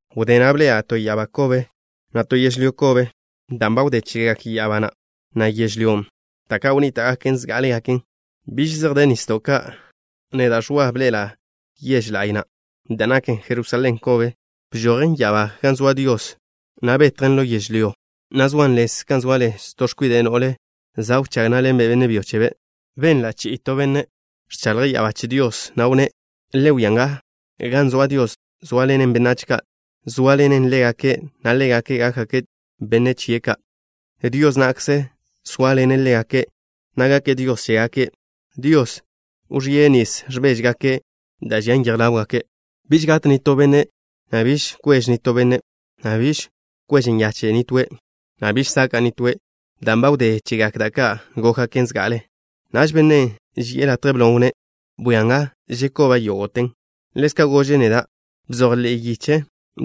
Wdé na' bḻe'ela' to ya'abá kobe, na' to yežlyó kobe, dan' ba wdé chegak ya'abá na', na' yežlyón', da' ka' wnníta'gaken zgá'alegaken. Biž zej de nisdo' ka'. Neda', Ẕwa, bḻe'ela' yež la'y na', da' naken Jerusalén kobe. Bžojen ya'abá gan zoa Dios, na' betjen ḻo yežlyó, na' zoan lez kan zoa lez to x̱kwide' no'le za' wchág ná'ḻenbe' benne' byo chebe'. Benla' che to benne' ẕchaḻje' ya'abá che Dios, na' wnné': “Le wia nga. Gan zoa Dios zóaḻenen benách ka'. Sóaḻene' ḻégake', na' ḻégake' gákgake' benne' chie' ka'. Dios na'kze sóaḻene' ḻégake', na' gake' Dios chégake'. Dios wẕíe' nis ẕbéžgake' da' žian yej ḻáwgake'. Biž gat nitó benne', na' biž kwež nitóe', na' biž kwež nyache' nitóe', na' biž saka' nitóe', dan' ba wdé chegak da' ka' gókgaken zga'ale.” Naž Bennen' ži'e latje blon' wnné': “Bwia nga. Žekoba' yógo'te.” Ḻezka' gože' neda': “Bzoj ḻe'e yiche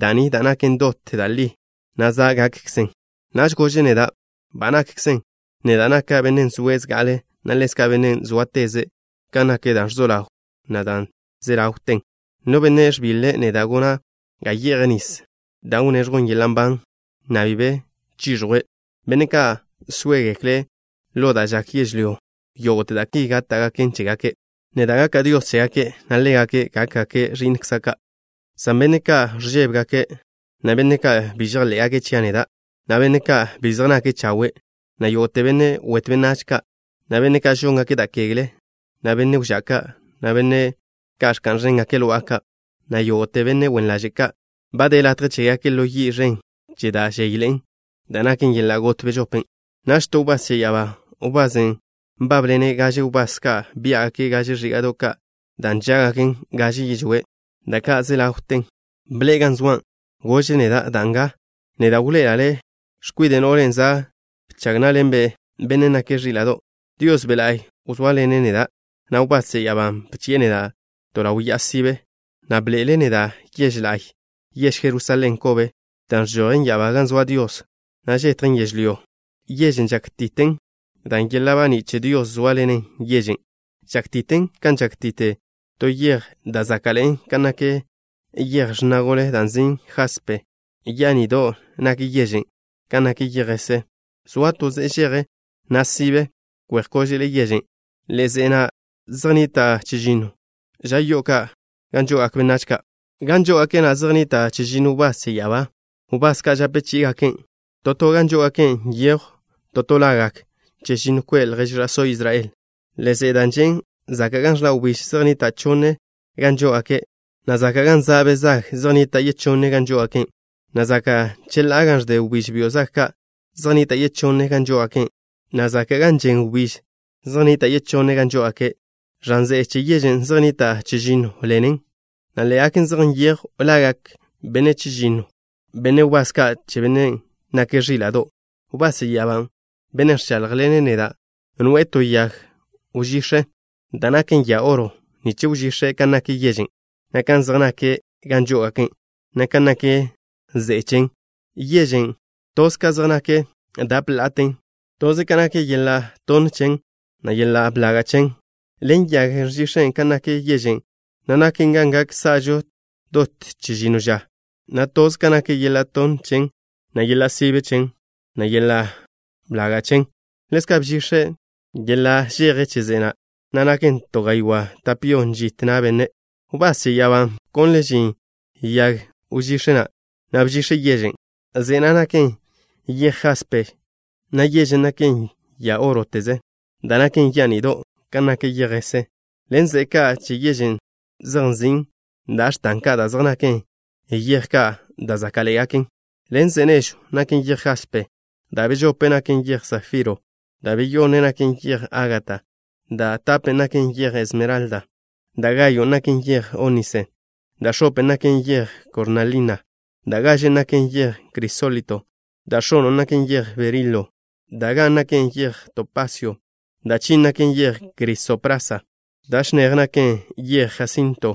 da' ni da' naken dot da' li, na' za' gakkzen.” Naž gože' neda': “Ba nakkzen. Neda' naka' Bennen' zoe' zga'ale', na' ḻezka' Bennen' sóateze' kan nak da' ẕzo ḻawn, na' da' ze ḻawten. No benne' ẕbiḻe', neda' gona' ga ye'je' nisen' da' wneẕjwn yeḻa' nban, na' bi be chiẕjwe'. Benne' ka' sóegekle' ḻo da' žak yežlyó, yógo'te da' ki gáta'gaken chégake'. Neda' gaka' Dios chégake', na' ḻégake' gákgake' ẕi'nkza' ka', san benne' ka' ẕžébegake', na' benne' ka' bi žejḻé'gake' chia' neda', na' benne' ka' bi zej nake' chawe', na' yógo'te benne' wetw benách ka', na' benne' ka' žóngake' da' kegle, na' benne' wžá' ka', na' benne' ka' ẕka'n ẕéngake' lo'a ka', na' yógo'te benne' wen ḻaže' ka', ba de latje chégake' ḻo yi' ẕen che da' ẕzéyḻe'en, da' naken yeḻa' got bežopen'.” Naž to wbás che ya'abá, wbasen' nbábḻene' gaže wbás ka' biá'gake' gaže ẕíga'do' ka' da' nžá'gaken gaže yižwé', da' ka' ze ḻawten, bḻe'e gan zoa'. Gože' neda': “Da nga. Neda' wḻoe'ela' le' x̱kwide' no'len' za' bchag ná'ḻenbe' Bennen' nake' Ẕíla'do'.” Dios Be' La'y wzóaḻene' neda', na' wbás che ya'abán' bchi'e neda' to ḻaw ya'a sibe, na' bḻoe'ele' neda' yež la'y, yež Jerusalén kobe, da' ẕžojen ya'abá gan zoa Dios, na' žetjen yežlyó. Yežen' žákti'ten dan' yeḻa' baní' che Dios zóaḻenen yežen'. Žákti'ten kan žákti'te to yej da' záka'ḻe'en kan nak yej x̱na gole da' nzin' jaspe. Yani'do' nak yežen' kan nak yej jese. Zoa to ze'e žeje, na' sibe, kwe'j x̱kóže'le yežen'. Ḻe'e ze'e na' zej nnita' chežinno gan žo'ogak benách ka'. Žoa'a gan žó'ogake' zej nnita' chežinno wbás che ya'abá, wbás ka' žape chí'igaken'. To to gan žó'ogake' nyejw to to lagak chežinno kwe' ljež ẕa'só Israel. Ḻe'e ze'e da' žen' zaka' gan ẕḻa' wbíž zej nnita' chonne gan žó'ogake', na' zaka' gan za' be' zag zej nnita' yechonne gan žó'ogake', na' zaka' cheḻá'a gan ẕde wbíž byo' zag ka' zej nnita' yechonne gan žó'ogake', na' zaka' gan žen wbíž zej nnita' yechonne gan žó'ogake'. Ẕan ze'e che yežen' zej nnita' chežinno ḻen ze'e, na' ḻé'egaken zej nyejw lagak benne' chežínnote benne' wbás ka' che Bennen' nake' Ẕíla'do'. Wbás che ya'abán', bennen' ẕcháḻjḻene' neda', noe'e to yag wžíx̱ da' naken ya oro nich wžix̱e' kan nak yežen', na' kan zej nak gan žó'ogake', na' kan nak ze'e chen. Yežen', tḻebe zej nak da' tape la'a ka'. Tḻebe nak yeḻa' tonne chen, na' yeḻa' blaga' chen. Ḻen yagen' bžix̱e' kan nak yežen', na' naken kan gak sa'žo dot chežinno ža, na' tḻebe zej nak yeḻa' tonne chen, na' yeḻa' sibe chen, na' yeḻa' blaga' chen. Ḻezka' bžix̱e' yeḻa' žeje che ze'e na', na' naken to gaywá' tape yon žit na' benne'. Wbás che ya'abán' bkonle' žin yag wžíx̱ na' nich bžix̱e' yežen'. Ze'e na' naken yej jaspe, na' yežen' naken ya óroteze, da' naken yani'do' kan nak yej jese. Ḻen ze'e ka' che yežen' zej nzin' da' x̱tan ka' da' zej naken yej ka' da' záka'ḻe'egaken. Ḻen ze'e nežw naken yej jaspe. Da' bežopen naken yej safiro. Da' beyonnen naken yej ágata. Da' tapen naken yej esmeralda. Da' gayon' naken yej ónise. Da' x̱open naken yej kornalina. Da' gažen naken yej crisólito. Da' x̱onon' naken yej berilo. Da' gan naken yej topasio. Da' chin naken yej crisoprasa. Da' chinéjen naken yej jasinto.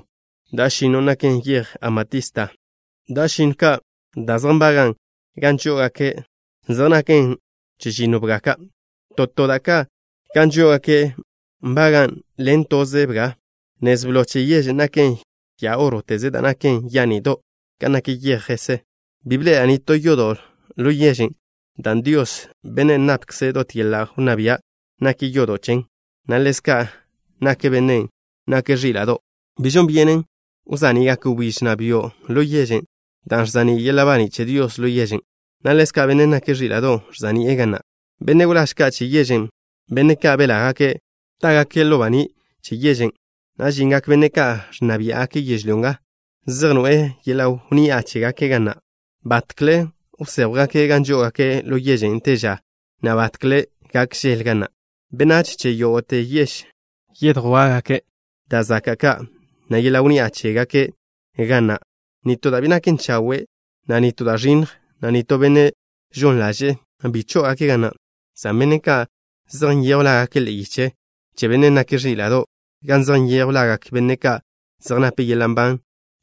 Da' chežinnon naken yej amatista. Da' chežinno ka' da' zej nbagan' gan žó'ogake' zej naken chežinno bga ka'. To to da' ka' gan žó'ogake' nbagan' ḻen toze bga. Nez blo che yežen' naken ya óroteze da' naken yani'do' kan nak yej jese. Bi bḻe'ela' nitó yodo' ḻo yežen' dan' Dios, Bennen' napkze' dot yeḻa' wnná bia', nake' yodo' chen, na' ḻezka' nak Bennen' nake' Ẕíla'do'. Bi žon byenen wza'ni'gak wbíž, na' byo', ḻo yežen' dan' ẕza'ní' yeḻa' baní' che Dios ḻo yežen', na' ḻezka' Benne' nake' Ẕíla'do' ẕza'ni'e ga na'. Benne' wláž ka' che yežen', benne' ka' belágake', tágake' ḻo baní' che yežen', na' žingak benne' ka' ẕnna biá'gake' yežlyó nga, zej noe'e yeḻa' wnni'a chégake' ga na'. Batkle wséjwgake' gan žó'ogake' ḻo yežen' te ža, na' batkle gak žel ga na'. Benách che yógo'te yež yedjwá'gake' da' zaka' ka', na' yeḻa' wnni'a chégake' ga na'. Nitó da' bi naken chawe', na' nitó da' ẕinnj, na' nitó benne' žon ḻaže'e, bi chó'ogake' ga na', san benne' ka' zej nyejw lágake' ḻe'e yiche che Bennen' nake' Ẕíla'do', gan zej nyejw lagak benne' ka' zej nape' yeḻa' nban,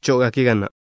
chó'ogake' ga na'.